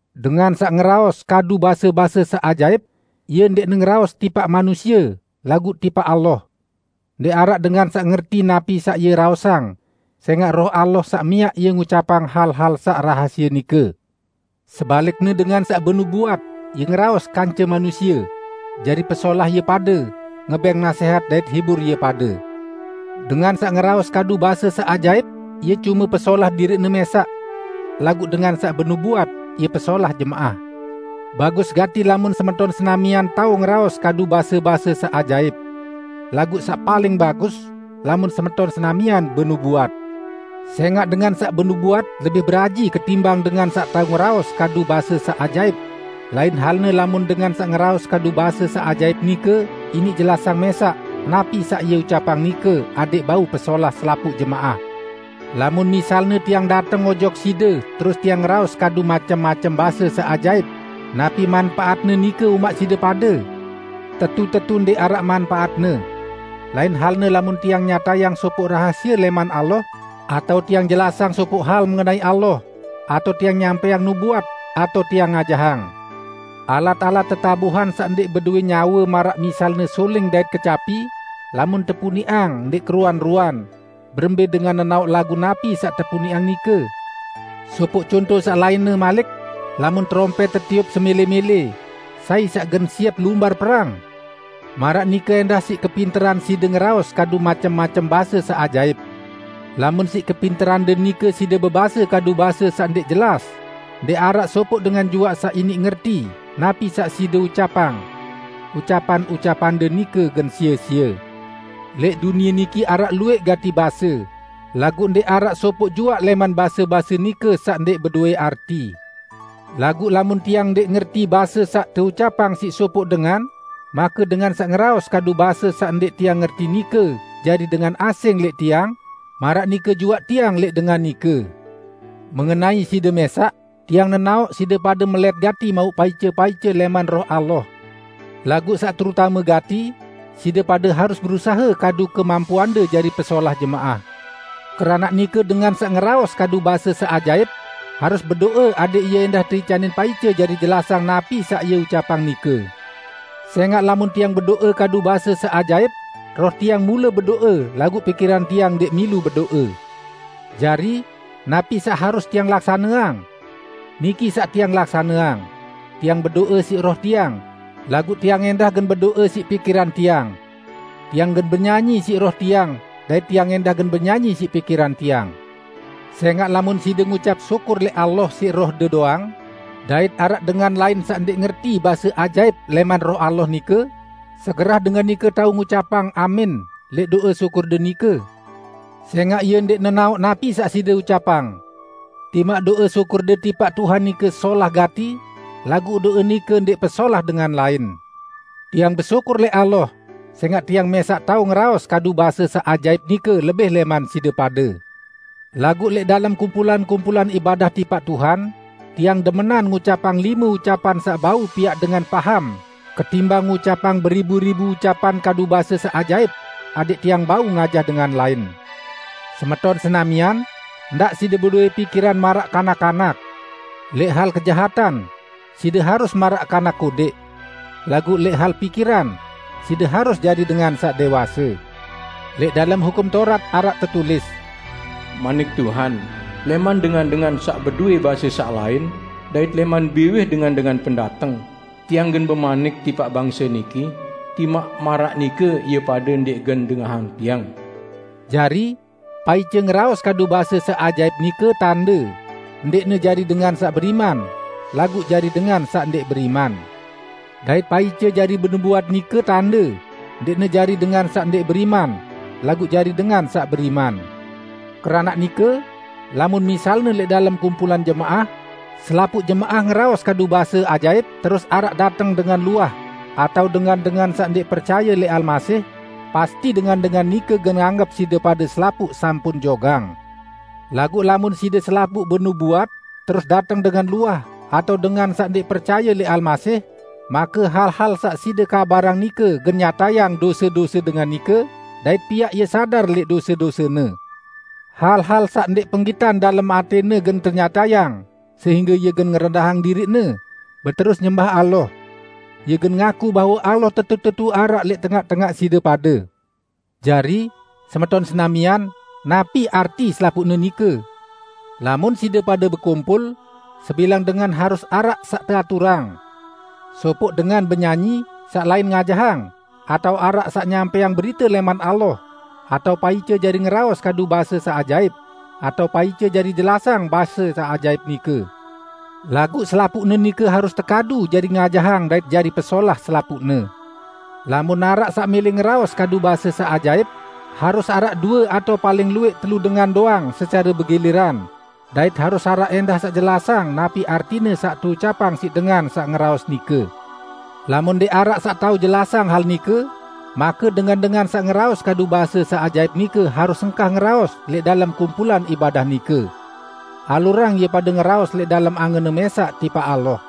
Dengan saq ngeraos kadu base-base saq ajaip, ie ndẽqne ngeraos tipaq manusie laguq tipaq Allah. Ndẽq araq dengan saq ngerti napi saq ie raosang, sẽngaq Roh Allah saq miaq ie ngucapang hal-hal saq rahasie nike. Sebalikne dengan saq benubuat, ie ngeraos kance manusie; jari pesolah ie pade, ngebẽng nasẽhat dait hibur ie pade. Dengan saq ngeraos kadu base saq ajaip, ie cume pesolah diriqne mẽsaq. Laguq dengan saq benubuat ie pesolah jemaah. Bagus gati lamun semeton senamian tao ngeraos kadu base-base saq ajaip. Laguq saq paling bagus, lamun semeton senamian benubuat. Sẽngaq dengan saq benubuat lebih beraji ketimbang dengan saq tao ngeraos kadu base saq ajaip; lain halne lamun dengan saq ngeraos kadu base saq ajaip nike iniq jelasang mẽsaq napi saq ie ucapang nike adẽq bau pesolah selapuq jemaah. Lamun misalne tiang dateng ojok side terus tiang ngeraos kadu macem-macem base saq ajaip napi manpaatne nike umaq side pade? Tetu-tetu ndẽq araq manpaatne! Lain halne lamun tiang nyatayang sopoq rahasie lẽman Allah, atao tiang jelasang sopoq hal mengenai Allah, atao tiang nyampẽang nubuat, atao tiang ngajahang. Alat-alat tetabuhan saq ndẽq bedowẽ nyawe maraq misalne suling dait kecapi, lamun tepuniqang ndẽq keruan-ruan, berembẽ dengan nenaoq lagu napi saq tepuniqang nike? Sopoq conto saq lainne malik: Lamun terompẽt tetiup semẽlẽ-mẽlẽ, sai saq gen siep lumbar perang? Maraq nike ẽndah siq kepinteran side ngeraos kadu macem-macem base saq ajaip. Lamun siq kepinterande nike side bebase kadu base saq ndẽq jelas, ndẽq araq sopoq dengan juaq saq iniq ngerti napi saq side ucapang. Ucapan-ucapande nike gen sie-sie. Lẽq dunie niki araq luwẽq gati base, laguq ndẽq araq sopoq juaq lẽman base-base nike saq ndẽq bedowẽ arti. Laguq lamun tiang ndẽq ngerti base saq teucapang siq sopoq dengan, make dengan saq ngeraos kadu base saq ndẽq tiang ngerti nike jari dengan asing lẽq tiang, maraq nike juaq tiang lẽq dengan nike. Mengenai side mẽsaq, tiang nenaoq side pade melẽt gati mauq paice-paice lẽman Roh Allah. Laguq saq terutame gati, side pade harus berusahe kadu kemampuande jari pesolah jemaah. Keranaq nike dengan saq ngeraos kadu base saq ajaip, harus bedo'e adẽq ie ẽndah teicanin paice jari jelasang napi saq ie ucapang nike. Sẽngaq lamun tiang bedo'e kadu base saq ajaip, roh tiang mule bedo'e laguq pikiran tiang ndẽq milu bedo'e. Jari, napi saq harus tiang laksaneang? Niki saq tiang laksaneang: Tiang bedo'e siq roh tiang, laguq tiang ẽndah gen bedo'e siq pikiran tiang. Tiang gen benyanyi siq roh tiang dait tiang ẽndah gen benyanyi siq pikiran tiang. Sẽngaq lamun side ngucap syukur lẽq Allah siq rohde doang, dait araq dengan lain saq ndẽq ngerti base ajaip lẽman Roh Allah nike, segerah dengan nike tao ngucapang, "Amin" lẽq do'e syukurde nike? Sẽngaq ie ndẽq nenaoq napi saq side ucapang. Timaq do'e syukurde tipaq Tuhan nike solah gati, laguq do'e nike ndẽq pesolah dengan lain. Tiang besyukur lẽq Allah sẽngaq tiang mẽsaq tao ngeraos kadu base saq ajaip nike lebih lẽman side pade. Laguq lẽq dalem kumpulan-kumpulan ibadah tipaq Tuhan, tiang demenan ngucapang lime ucapan saq bau piaq dengan paham ketimbang ngucapang beribu-ribu ucapan kadu base saq ajaip, adẽq tiang bau ngajah dengan lain. Semeton senamian, ndaq side bedowẽ pikiran maraq kanak-kanak. Lẽq hal kejahatan, side harus maraq kanak kodẽq. Laguq lẽq hal pikiran, side harus jari dengan saq dẽwase. Lẽq dalem Hukum Taurat araq tetulis, "Manik Tuhan, 'Lẽman dengan-dengan saq bedowẽ base saq lain, dait lẽman biwih dengan-dengan pendateng, Tiang gen bemanik tipaq bangse niki, timaq maraq nike ie pade ndẽq gen dengahang Tiang.' " Jari, paice ngeraos kadu base saq ajaip nike tande, ndẽqne jari dengan saq beriman, laguq jari dengan saq ndẽq beriman; dait paice jari benubuat nike tande, ndẽqne jari dengan saq ndẽq beriman, laguq jari dengan saq beriman. Keranaq nike, lamun misalne lẽq dalem kumpulan jemaah, selapuq jemaah ngeraos kadu base ajaip, terus araq dateng dengan luah, atao dengan-dengan saq ndẽq percaye lẽq Almasih, pasti dengan-dengan nike gen anggep side pade selapuq sampun jogang! Laguq lamun side selapuq benubuat, terus dateng dengan luah atao dengan saq ndẽq percaye lẽq Almasih, make hal-hal saq side kabarang nike gen nyatayang dose-dose dengan nike dait piaq ie sadar lẽq dose-dosene. Hal-hal saq ndẽq penggitan dalem atẽne gen tenyatayang, sehingge ie gen ngerendahang diriqne, beterus nyembah Allah. Ie gen ngaku bahwe Allah tetu-tetu araq lẽq tengaq-tengaq side pade. Jari, semeton senamian, napi arti selapuqne nike? Lamun side pade bekumpul, sebilang dengan harus araq saq teaturang: Sopoq dengan benyanyi, saq lain ngajahang, atao araq saq nyampẽang berite lẽman Allah, atao paice jari ngeraos kadu base saq ajaip, atao paice jari jelasang base saq ajaip nike, laguq selapuqne nike harus tekadu jari ngajahang dait jari pesolah selapuqne. Lamun araq saq mẽlẽ ngeraos kadu base saq ajaip, harus araq due atao paling luwẽq telu dengan doang secare begiliran, dait harus araq ẽndah saq jelasang napi artine saq teucapang siq dengan saq ngeraos nike. Lamun ndẽq araq saq tao jelasang hal nike, make dengan-dengan saq ngeraos kadu base saq ajaip nike harus engkah ngeraos lẽq dalem kumpulan ibadah nike. Alurang ie pade ngeraos lẽq dalem angenne mẽsaq tipaq Allah.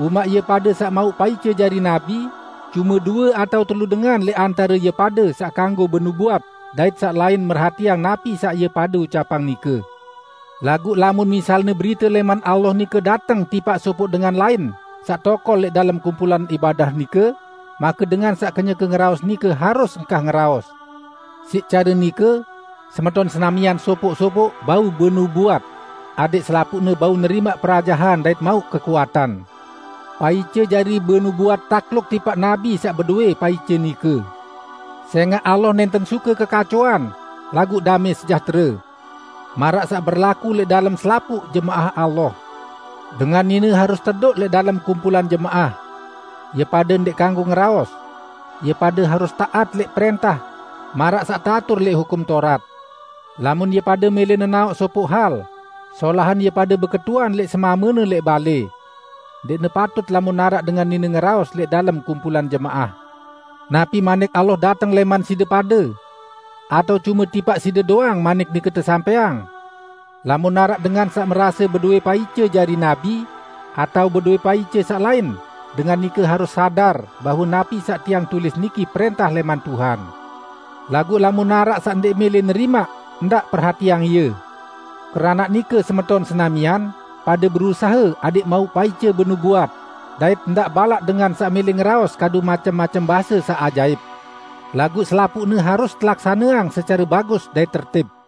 Umaq ie pade saq mauq paice jari nabi, cume due atao telu dengan lẽq antare ie pade saq kanggo benubuat, dait saq lain merhatiang napi saq ie pade ucapang nike. Laguq lamun misalne berite lẽman Allah nike dateng tipaq sopoq dengan lain saq tokol lẽq dalem kumpulan ibadah nike, make dengan saq kenyeke ngeraos nike harus engkah ngeraos. Siq care nike, semeton senamian sopoq-sopoq bau benubuat; adẽq selapuqne bau nerimaq perajahan dait mauq kekuatan. Paice jari benubuat takluk tipaq nabi saq bedowẽ paice nike. Sẽngaq Allah nẽnten suke kekacoan, laguq damẽ sejahtere. Maraq saq berlaku lẽq dalem selapuq jemaah Allah, dengan nine harus tedoq lẽq dalem kumpulan jemaah. Ie pade ndẽq kanggo ngeraos. Ie pade harus taat lẽq prẽntah, maraq saq teatur lẽq Hukum Taurat. Lamun ie pade mẽlẽ nenaoq sopoq hal, solahan ie pade beketuan lẽq semamene lẽq balẽ. Ndẽqne patut lamun araq dengan nine ngeraos lẽq dalem kumpulan jemaah. Napi Manik Allah dateng lẽman side pade? Atao cume tipaq side doang manik nike tesampẽang? Lamun araq dengan saq merase bedowẽ paice jari nabi, atao bedowẽ paice saq lain, dengan nike harus sadar bahwe napi saq tiang tulis niki prẽntah lẽman Tuhan. Laguq lamun araq saq ndẽq mẽlẽ nerimaq, ndaq perhatiang ie. Keranaq nike semeton senamian, pade berusahe adẽq mauq paice benubuat, dait ndaq balaq dengan saq mẽlẽ ngeraos kadu macem-macem base saq ajaip. Laguq selapuqne harus telaksaneang secare bagus dait tertib.